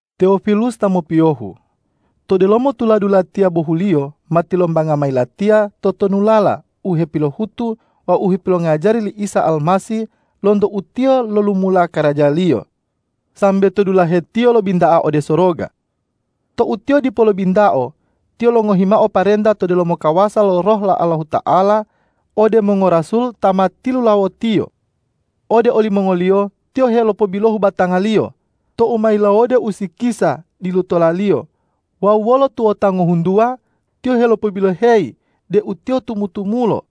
Tewofilus ta mopiyohu. To delomo tuladu latiya bohuliyo ma tilombanga mayi latiya totonulala u hepilohutu wawu u hepilongajari li Isa Almasih lonto u Tiyo lolumula karaja-Liyo sambe to dulahe Tiyo lobinta'a ode soroga. Tou Tiyo dipo lobintao, Tiyo longohi mao parenta to delomo kawasa lo Roh lo Allahuta'ala ode mongorasul ta ma tilulawo-Tiyo. Ode olimongoliyo Tiyo helopobilohu batanga-Liyo tou ma yilawode usikisa dilutola-Liyo wawu wolo tuwota ngohuntuwa Tiyo helopobiloheyi deu Tiyo tumu-tumulo.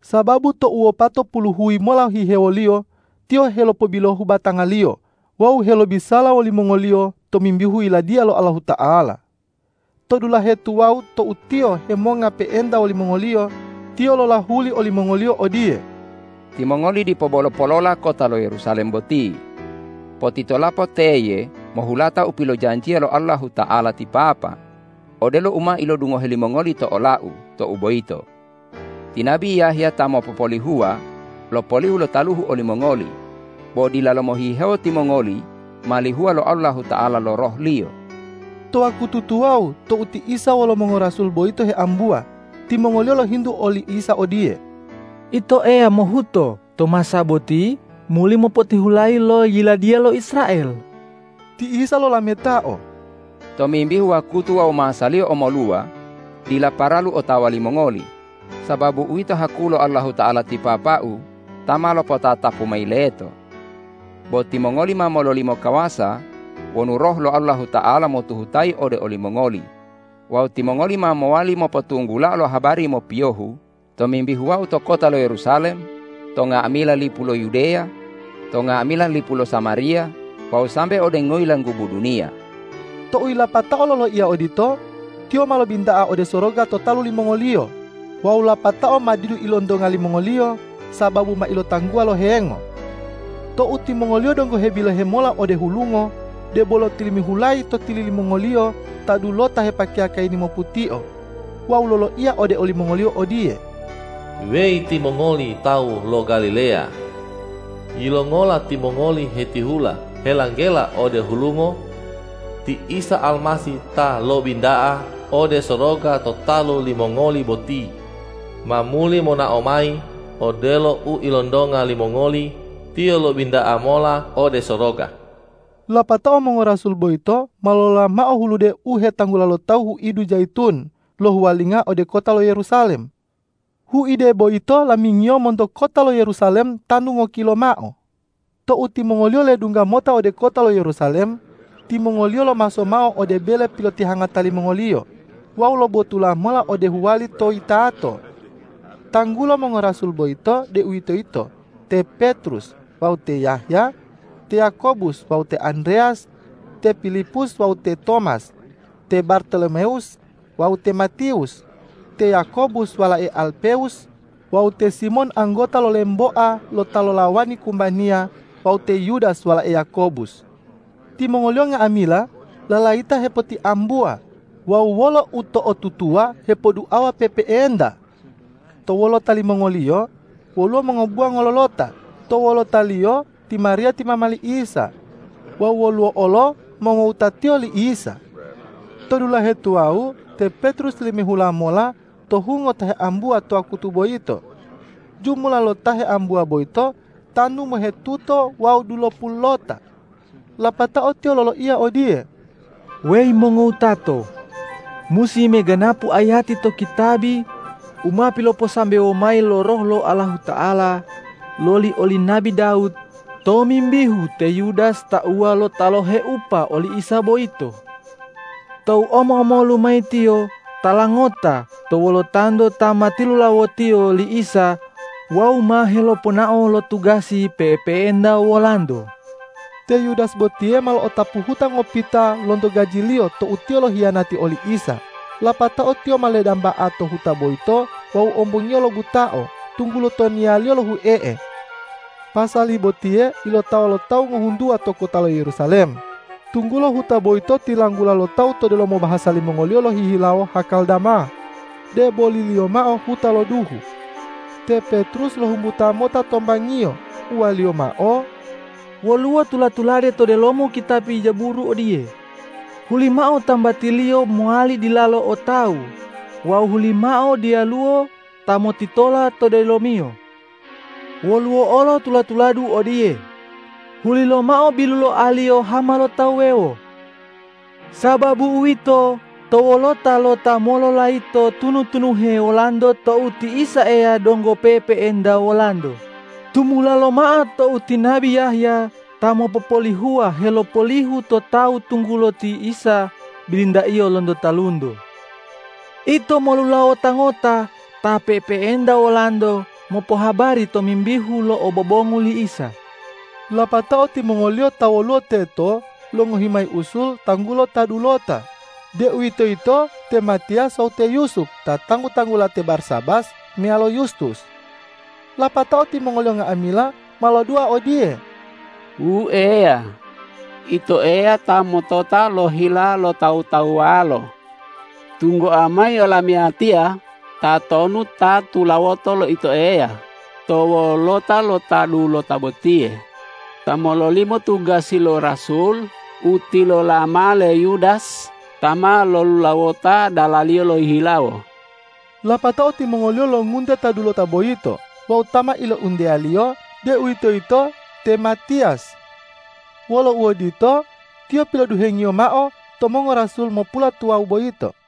Sababu tou wopatopulu huyi mola hihewoliyo, Tiyo helopobilohu batanga-Liyo wawu helobisala wolimongoliyo tomimbihu Yiladiya lo Allahuta'ala. To dulahe tuwawu tou Tiyo hemonga pe'enta wolimongoliyo, Tiyo lolahuli olimongoliyo odiye,”Timongoli dipo bolo polola kota lo Yerusalem boti. Potitolapo teye mohulata u pilojanjiya lo Allahuta'ala ti Papa, odelo u ma ilodungohe limongoli to ola-U tou boyito. Ti nabi Yahya ta mopopolihuwa lopolihu lo taluhu olimongoli, bo dilalo mohihewo timongoli ma lihuwa lo Allahuta'ala lo Roh-Liyo.” To wakutu tuwawu tou ti Isa wolo mongorasul boyito heambuwa, timongoliyo lohintu oli Isa odiye,”Ito Eya mohuto to masa boti muli mopotihulayi lo yiladiya lo Israel?” Ti Isa lolametao,”Tomimbihu wakutu wawu masaliyo omoluwa dila paralu otawa limongoli sababu uwito haku lo Allahuta'ala ti Papa-U ta ma lopotatapu mayi leto. Bo timongoli ma mololimo kawasa wonu Roh lo Allahuta'ala motuhutayi ode olimongoli wawu timongoli ma mowali mopotunggulao lo habari mopiyohu tomimbihu Wau to kota lo Yerusalem, to nga'amila lipu lo Yudeya, to nga'amila lipu lo Samariya wawu sambe ode ngoyilanggubu duniya.” Tou yilapatao loloiya odito, Tiyo ma lobinta'a ode soroga to talu limongoliyo wawu lapatao ma didu ilontonga limongoliyo sababu ma ilotangguwa lo hengo. Tou timongoliyo donggo hebilohe mola ode hulungo, debolo tilimihulayi to tili limongoliyo ta dulota hepakeya kayini moputio wawu loloiya ode olimongoliyo odiye,”Weyi timongoli tawu lo Galileya! Yilongola timongoli hetihula helanggela ode hulungo? Ti Isa Almasih ta lobinta'a ode soroga to talu limongoli boti, ma muli monao mayi odelo u ilontonga limongoli Tiyo lobinta'a mola ode soroga.” Lapatao mongorasul boyito ma lolola mao hulude u hetanggula lo tawu huidu Jayitun lohuwalinga ode kota lo Yerusalem. Huide boyito lamingiyo monto kota lo Yerusalem tanu ngokilo mao. Tou timongoliyo ledungga mota ode kota lo Yerusalem, timongoliyo lomaso mao ode bele pilotihangata limongoliyo wawu lobotula mola ode huwali to yitato. Tanggulo mongorasul boyito, deuwitoyito te Petrus wawu te Yahya, te Yakobus wawu te Andreyas, te Pilipus wawu te Tomas, te Bartolomewus wawu te Matiwus, te Yakobus walae Alpewus wawu te Simon anggota lo lemboa lo ta lolawani kumbaniya wawu te Yudas walae Yakobus. Timongoliyo nga'amila lalayita hepotiambuwa wawu wolo uto'otutuwa hepoduawa pe'epe'enta. To wolota limongoliyo woluwo mongobuwa ngololota to wolotaliyo ti Mariya ti mama li Isa wawu woluwo olo mongowutatiyo li Isa. To dulahe tuwawu te Petrus tilimihula mola to hungo ta heambuwa to wakutu boyito. Jumula lo ta heambuwa boyito tanu mohetuto wawu dulopululota. Lapatao tiyo loloiya odiye, ”Weyi mongowutato! Musi meganapu ayati to kitabi u ma piloposambewo mayi lo Roh lo Allahuta'ala loli oli nabi Dawud tomimbihu te Yudas tauwa lo ta loheupa oli Isa boyito. Tou omo-omolu mayi tiyo tala ngota to wolotanto ta ma tilulawotiyo li Isa wawu ma heloponao lo tugasi pe'epe'enta wolanto.” Te Yudas botiye ma lo'otapu huta ngopita lonto gajiliyo tou tiyo lohiyanati oli Isa, lapatao tiyo ma ledamba'a to huta boyito wawu ombongiyo lobutao, tunggulo toniyaliyo lohue'e. Pasali botiye ilotawa lo tawu ngohuntuwa to kota lo Yerusalem, tunggulo huta boyito tilanggula lo tawu to delomo bahasa limongoliyo lohihilawo Hakal Dama, deboliliyo mao huta lo duhu. Te Petrus lohumbuta mota tombangiyo, uwaliyo mao,”Woluwo tula-tulade to delomo kitabi Jaburu odiye, ’Hulimao tambatiliyo mowali dilalo o tawu wawu hulimao diyaluwo ta motitola to delomiyo.’ Woluwo olo tula-tuladu odiye, ’Hulilomao biluloaliyo hama lo tawu wuwewo.’ Sababu uwito, to wolota lo ta mololayito tunu-tunuhe olanto tou ti Isa Eya donggo pe'epe'enta wolanto, tumula lomao tou ti nabi Yahya ta mopopolihuwa helopolihu to tawu tunggulo ti Isa bilintaiyo lonto talunto. Ito molulawota ngota ta pe'epe'enta wolanto mopohabari tomimbihu lo obobongu li Isa.” Lapatao timongoliyo ta woluwo teto longohi mayi usul tanggulo ta dulota, deuwitoyito te Matiyas wawu te Yusup ta tanggu-tanggula te Barsabas meyalo Yustus. Lapatao timongoliyo nga'amila ma lodua odiye,”Wu Eya, Ito Eya ta motota lo hila lo tawu-tawuwalo. Tunggoa mayi olamiyatiya tatonu ta tulawoto lo Ito Eya to wolota lo ta dulota botiye, ta mololimo tugasi lo rasul u tilola mao le Yudas ta ma lolulawota dalaliyo lohihilawo.” Lapatao timongoliyo longunte ta dulota boyito wawu ta ma ilounteyaliyo, deuwitoyito te Matiyas. Wolo uodito, tiyo piloduhengiyo mao to mongorasul mopulatuwawu boyito.